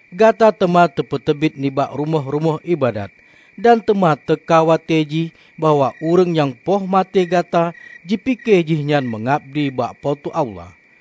Gata teuma teupeuteubiet nibak rumoh-rumoh iébadat. Dan teuma teuka watée jih bahwa ureuëng nyang poh maté gata jipike jihnyan meungabdi bak Po teu Allah.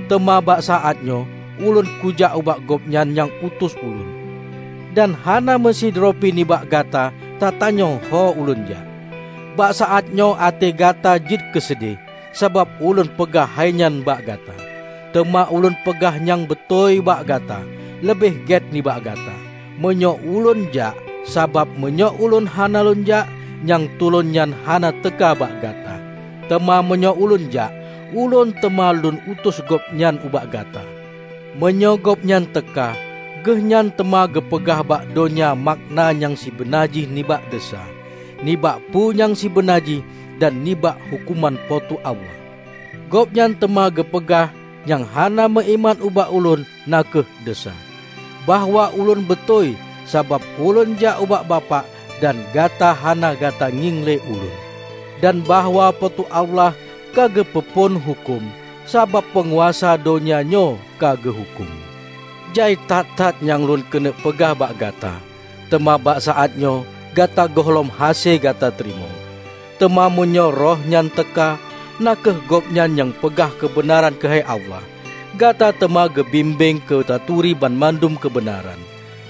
Teuma bak saát nyoe Ulôn kujak ubak Gobnyan nyang utus Ulôn; dan hana meusidroe pi nibak gata tatanyong ho Ulôn jak. Bak saát nyoe até gata jeuet keuseudeh, sabab Ulôn peugah hainyan bak gata. Teuma Ulôn peugah nyang beutôi bak gata: Leubeh gét nibak gata, meunyoe ulônjak; sabab meunyoe Ulôn hana lônjak, Nyang tulông nyan hana teuka bak gata. Teuma meunyoe ulônjak, Ulôn teuma lôn utus Gobnyan ubak gata. Meunyoe Gobnyan teuka, Geuhnyan teuma geupeugah bak donya makna nyang sibeuna jih nibak desya, nibak peue nyang sibeuna jih, dan nibak huköman Po teu Allah. Gobnyan teuma geupeugah nyang hana meuiman ubak Ulôn na kheueh desya; bahwa Ulôn beutôi, sabab Ulôn jak ubak Bapak dan gata hana gata ngieng le Ulôn; dan bahwa Po teu Allah ka geupeu phon huköm, sabab peunguasa donya nyoe ka geuhuköm. Jai that-that nyang lôn keuneuk peugah bak gata, teuma bak saát nyoe gata gohlom hase gata teurimong. Teuma meunyoe Rohnyan teuka, na kheueh Gobnyan nyang peugah keubeunaran keuhai Allah, gata teuma geubimbéng keu taturi banmandum keubeunaran.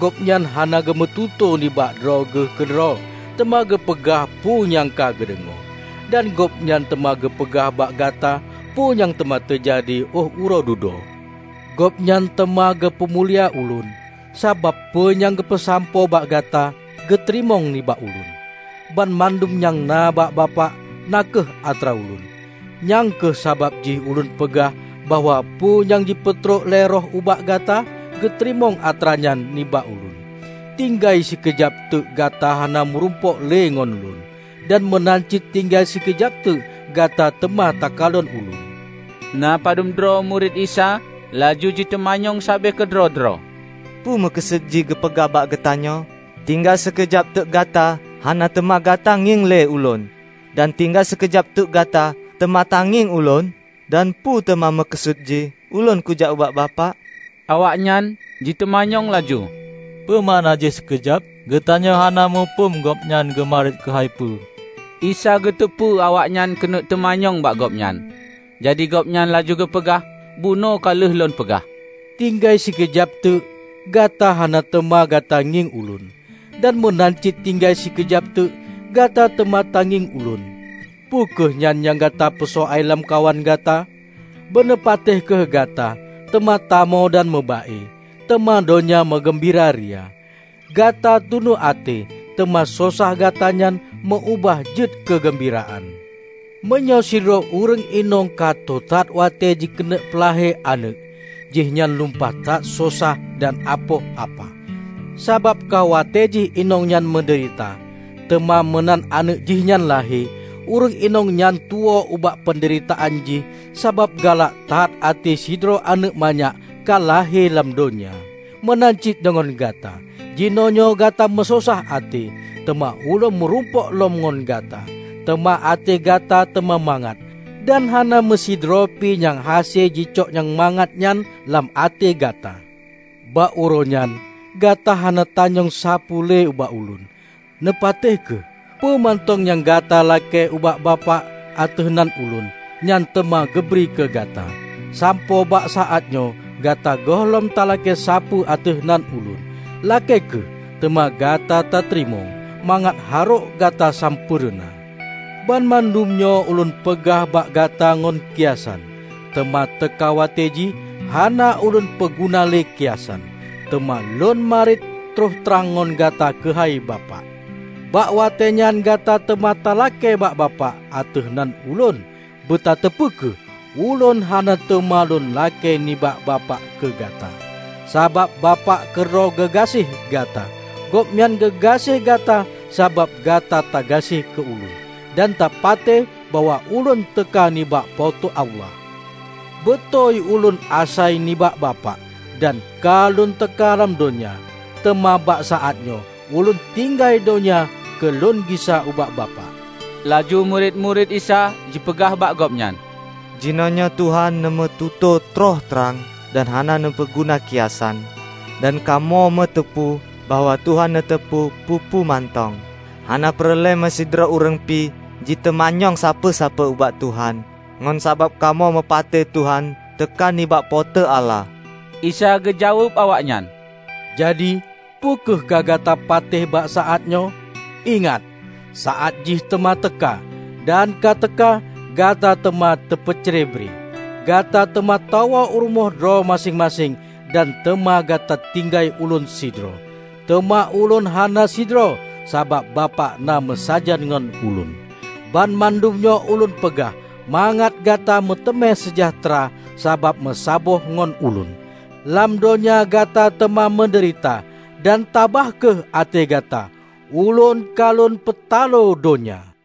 Gobnyan hana geumeututoe nibak droe Geuh keudroe teuma geupeugah peue nyang ka geudeungoe, dan Gobnyan teuma geupeugah bak gata peue nyang teuma teujadi óh uroe dudoe. Gobnyan teuma geupeu mulia Ulôn, sabab peue nyang geupeusampoe bak gata, geuteurimong nibak Ulôn. Banmandum nyang na bak Bapak na kheueh atra Ulôn. Nyang kheueh sabab jih ulôn peugah bahwa peue nyang jipeutrok lé Roh ubak gata, geuteurimong atranyan nibak Ulôn." "Tinggai sikeujab teuk gata hana meurumpok le ngon Lôn, dan meunan cit tinggai sikeujab teuk gata teuma takalon Ulôn." Na padubdroe murit Isa laju jiteumanyong sabe keudroe-droe, "Peue meukeusut jih geupeugah bak geutanyoe: 'Tinggai sikeujab teuk gata hana teuma gata ngieng le Ulôn, dan tinggai sikeujab teuk gata teuma tangieng ulôn'? Dan peue teuma meukeusut jih: 'Ulôn kujak ubak Bapak'?" Awaknyan jiteumanyong laju, "Peue makna jih, 'Sikeujab'? Geutanyoe hana muphom Gobnyan geumariet keuhai peue!" Isa geuteupeue awaknyan keuneuk teumanyong bak Gobnyan. Jadi Gobnyan laju geupeugah, "Bunoe ka lheueh lôn peugah, 'Tinggai sikeujab teuk, gata hana teuma gata ngieng Ulôn, dan meunan cit tinggai sikeujab teuk gata teuma tangieng Ulôn'. Peu kheueh nyan nyang gata peusoai lamkawan gata? Beuneupatéh kheueh gata teuma tamo dan meuba-e, teuma donya meugeumbiraria. Gata tunu até, teuma sosah gata nyan meu-ubah jeuet keu geumbiraan. Meunyoe sidroe ureuëng inong ka tô that watée jikeuneuk peulahé aneuëk, jihnyan lumpah that sosah dan apoh apah, sabab ka watée jih inong nyan meudeurita. Teuma meunan aneuëk jihnyan lahé, ureuëng inong nyan tuwoe ubak peundeuritaan jih sabab galak that até sidroe aneuëk manyak ka lahé lam donya. Meunan cit deungon gata: Jinoenyoe gata meusosah até, teuma Ulôn meurumpok lom ngon gata, teuma até gata teuma mangat; dan hana meusidroe pi nyang hase jicok nyang mangat nyan lam até gata. Bak uroe nyan, gata hana tanyong sapeue le ubak Ulôn. Neupatéh kheueh: Peue mantong nyang gata lakée ubak Bapak ateueh nan Ulôn, nyan teuma geubri keu gata. Sampoe bak saát nyoe gata gohlom talakée sapeue ateueh nan ulôn. Lakée kheueh, teuma gata tateurimong, mangat harok gata sampoereuna." "Banmandum nyoe ulôn peugah bak gata ngon kiasan. Teuma teuka watée jih, hana ulôn peuguna le kiasan, teuma lôn mariet troh trang ngon gata keuhai Bapak. Bak watée nyan gata teuma talakée bak bapak ateueh nan Ulôn; beutateupeue kheueh, Ulôn hana teuma lôn lakée nibak Bapak keu gata, Sabab Bapak keudroe geugaséh gata. Gobnyan geugaséh gata sabab gata tagaséh keu Ulôn, dan tapatéh bahwa Ulôn teuka nibak Po teu Allah. Beutôi Ulôn asai nibak Bapak, dan ka lôn teuka lam donya. Teuma bak saát nyoe Ulôn tinggai donya keu lôn gisa ubak Bapak." Laju murit-murit Isa jipeugah bak Gobnyan, "Jinoenyoe Tuhan neumeututoe troh trang dan hana neupeuguna kiasan, dan kamoe meuteupeu bahwa Tuhan neuteupeue peue-peue mantong. Hana peureulée meusidroe ureuëng pi jiteumanyong sapeue-sapeue ubak Tuhan. Ngon sabab kamoe meupatéh Tuhan teuka nibak Po teu Allah." Isa geujaweueb awaknyan, "Jadi, peu kheueh ka gata patéh bak saát nyoe? Ingat! Saát jih teuma teuka, dan ka teuka, gata teuma teupeucre bre. Gata teuma tawoe u rumoh droe maséng-maséng dan teuma gata tinggai Ulôn sidroe. Teuma Ulôn hana sidroe sabab Bapak na meusajan ngon Ulôn. Banmandum nyoe Ulôn peugah mangat gata meuteumé seujahteura sabab meusaboh ngon Ulôn. Lam donya gata teuma meudeurita. Dan tabah kheueh até gata! Ulôn ka Lôn peutaloe donya!"